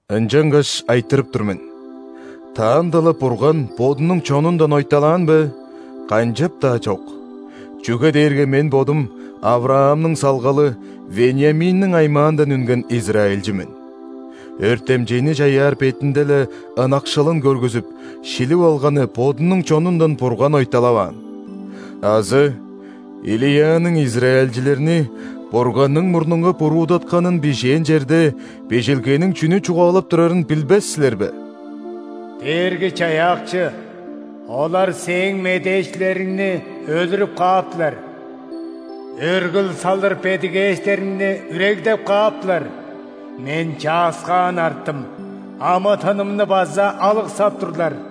Ынчангаш айтырып тур мен: таанда-ла Бурган Бодунуң чонундан ойталаан бе? Канчап-даа чок! Чүге дээрге мен бодум – ·Авраамның салгалы, Вениаминниң аймаандан үнген израильчи мен. Өртемчейни чаяар бетинде-ле ынакшылын көргүзүп, шилип алганы Бодунуң чонундан Бурган ойталаваан. Азы Илияның израильчилерни Бурганның мурнунга буруудатканын бижээн черде Бижилгениң чүнү чугаалап турарын билбес силер бе: «Дээрги-Чаяакчы, олар Сээң медээчилериңни өлүрүп кааптылар,өргүл салыр бедигээштериңни үрегдеп кааптылар,мен чааскаан арттым, амы-тынымны база алыксап турлар».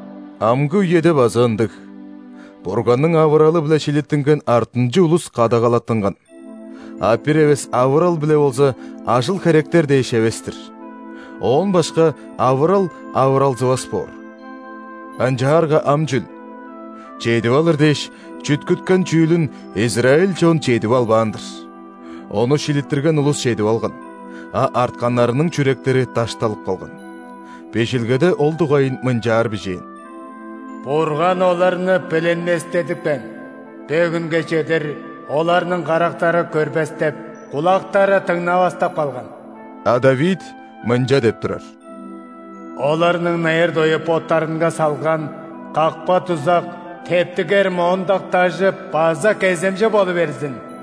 Амгы үеде база ындыг: Бурганның авыралы-биле шилиттинген артынчы улус кадагалаттынган. А бир эвес авырал-биле болза, ажыл-херектер дээш эвес-тир. Оон башка авырал авыралзывас боор. Ынчаарга ам чүл? Чедип алыр дээш, чүткүткен чүүлүн израиль чон чедип албаан-дыр. Ону шилиттирген улус чедип алган, а артканнарының чүректери дашталып калган. Бижилгеде ол дугайын мынчаар бижээн:«Бурган оларны билинместедипкен,бо хүнге чедир оларның карактары көрбестеп,кулактары дыңнавастап калган». А ·Давид мынча деп турар:«Оларның найыр-дою боттарынга салган какпа-дузак,тептигер моондак дажы база кеземче болу берзин.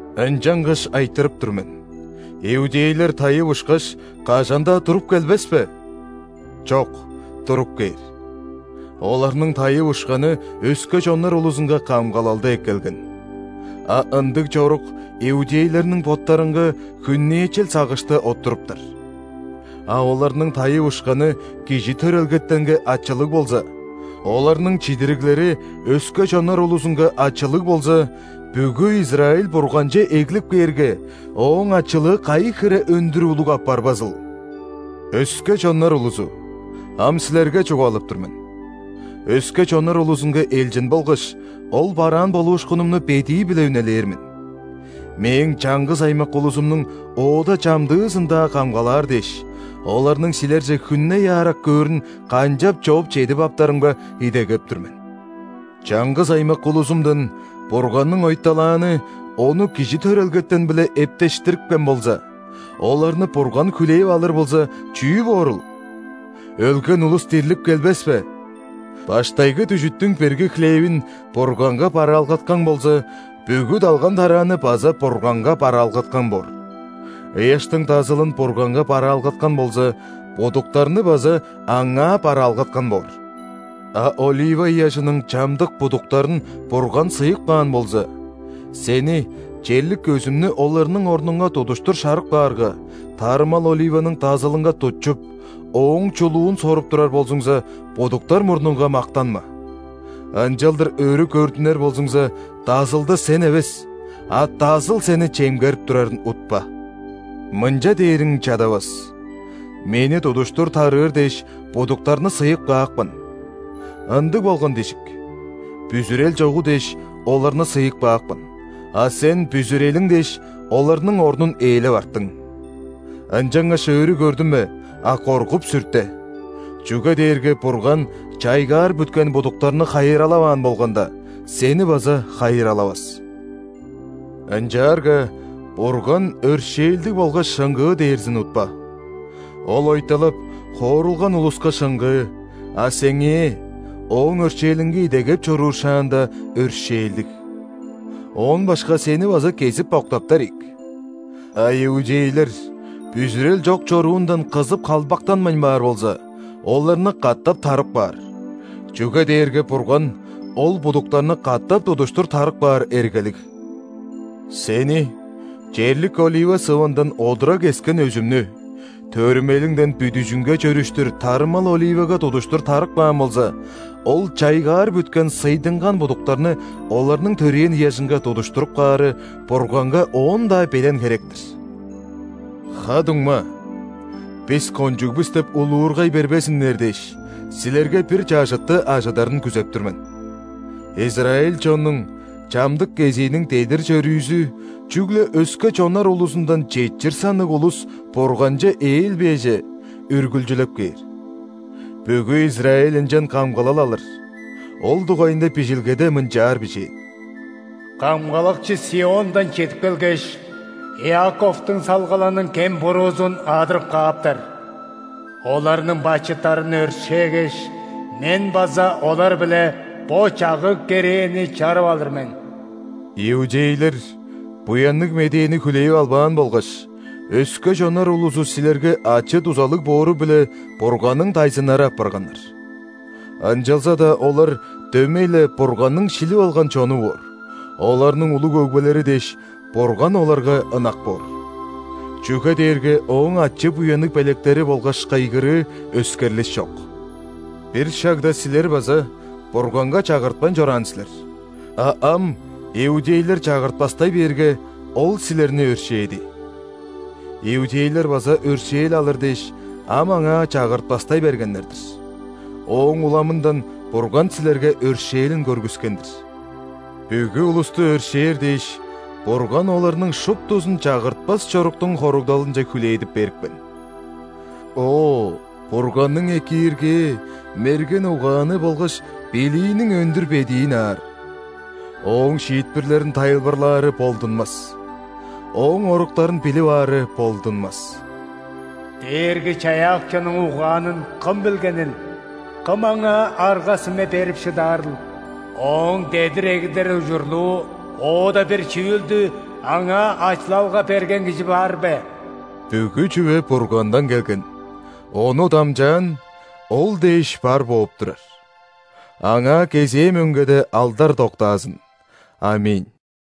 Ынчангаш айтырып тур мен: иудейлер тайып ушкаш, кажан-даа туруп келбес бе? Чок, туруп кээр! Оларның тайып ушканы өске чоннар улузунга камгалалды эккелген. А ындыг чорук иудейлерниң боттарынга хүннээчел сагышты оттуруптар. А оларның тайып ушканы кижи төрелгетенге ачылыг болза; оларның чидириглери өске чоннар улузунга ачылыг болза, бүгү Израиль Бурганче эглип кээрге, ооң ачылыы кайы хире өндүр улуг апарбазыл? Өске чоннар улузу, ам силерге чугаалап тур мен: өске чоннар улузунга элчин болгаш, ол бараан болуушкунумну бедии-биле үнелээр мен. Мээң чаңгыс аймак улузумнуң оода чамдыызын-даа камгалаар дээш, оларның силерже хүнней аарак көөрүн канчап-чооп чедип аптарымга идегеп тур мен. Чаңгыс аймак улузумдан Бурганның ойталааны Ону кижи төрелгетен-биле эптештирипкен болза, оларны Бурган хүлээп алыр болза, чүү боорул?! Өлген улус дирлип келбес бе?! Баштайгы дүжүттүң бирги хлевин Бурганга бараалгаткан болза, бүгү далган-тарааны база Бурганга бараалгаткан боор. Ыяштың дазылын Бурганга бараалгаткан болза, будуктарны база Аңаа бараалгаткан боор. А олива ыяжының чамдык будуктарын Бурган сыйып каан болза, сени – черлик өзүмнү оларның орнунга тудуштур шарып каарга, тарымал оливаның дазылынга тутчуп, ооң чулуун соруп турар болзуңза, будуктар мурнунга мактанма. Ынчалдыр өрү көрдүнер болзуңза, дазылды сен эвес, а дазыл сени чемгерип турарын утпа. Мынча дээриң чадавас: «Мени тудуштур тарыыр дээш, будуктарны сыйып каапкан». Ындыг болган дижик. Бүзүрел чогу дээш, оларны сыйып каапкан, а сен, бүзүрелиң дээш, оларның орнун ээлеп арттың. Ынчангаш өрү көрдүнме, а коргуп-сүрте! Чүге дээрге Бурган чайгаар бүткен будуктарны хайыралаваан болганда, сени база хайыралавас. Ынчаарга Бурган өршээлдиг болгаш шыңгыы дээрзин утпа. Ол ойталап, хоорулган улуска шыңгыы, а сеңээ – Ооң өршээлинге идегеп чоруур шааңда – өршээлдиг. Оон башка сени база кезип октаптар ийик. А иудейлер бүзүрел чок чоруундан кызып халбактанмайн баар болза, оларны катап тарып каар, чүге дээрге Бурган ол будуктарны катап тудуштур тарып каар эргелиг. Сени, черлик олива сывындан одура кескен өзүмнү, төрүмелиңден бүдүжүңге чөрүштүр тарымал оливага тудуштур тарып каан болза, ол чайгаар бүткен сыйдынган будуктарны оларның төрээн ыяжынга тудуштуруп каары Бурганга оон-даа белен херек-тир. Ха-дуңма, «Бис кончуг бис» деп улуургай бербезиннер дээш, силерге бир чажытты ажыдарын күзеп тур мен: израиль чоннуң чамдык кезииниң дедир-чөрүүзү чүгле өске чоннар улузундан четчир санныг улус Бурганче ээлбээже, үргүлчүлеп кээр. Бүгү Израиль ынчан камгалал алыр. Ол дугайында Бижилгеде мынчаар бижээн:«Камгалакчы ·Сиондан чедип келгеш,Иаковтуң салгалының кем-буруузун адырып кааптар. Оларның бачыттарын өршээгеш,Мен база олар-биле бо чагыг-керээни чарып алыр мен». Иудейлер Буянныг Медээни хүлээп албаан болгаш, өске чоннар улузу силерге ачы-дузалыг боору-биле Бурганның дайзыннары апарганнар. Ынчалза-даа олар дөмей-ле Бурганның шилип алган чону боор, оларның улуг өгбелери дээш, Бурган оларга ынак боор. Чүге дээрге Ооң ачы-буянныг белектери болгаш кыйгырыы өскерлиш чок! Бир шагда силер база Бурганга чагыртпайн чораан силер, а ам иудейлер чагыртпастай бээрге, Ол силерни өршээди. Иудейлер база өршээл алыр дээш, ам Аңаа чагыртпастай бергеннер-дир, ооң уламындан Бурган силерге өршээлин көргүскен-дир. Бүгү улусту өршээр дээш, Бурган оларның шуптузун чагыртпас чоруктуң хоругдалынче хүлээдип берипкен. О, Бурганның экииргээ, мерген угааны болгаш билииниң өндүр бедиин аар! Ооң шиитпирлерин тайылбырлаары болдунмас! Ооң оруктарын билип аары болдунмас! «Дээрги-Чаяакчының угаанын кым билгенил,кым Аңаа арга-сүме берип шыдаарыл? Ооң дедир эгидер ужурлуу оода бир чүүлдүАңаа ачылалга берген кижи бар бе?» Бүгү чүве Бургандан келген; Ону дамчаан; Ол дээш бар бооп турар. Аңаа кезээ мөңгеде алдар доктаазын! ·Аминь.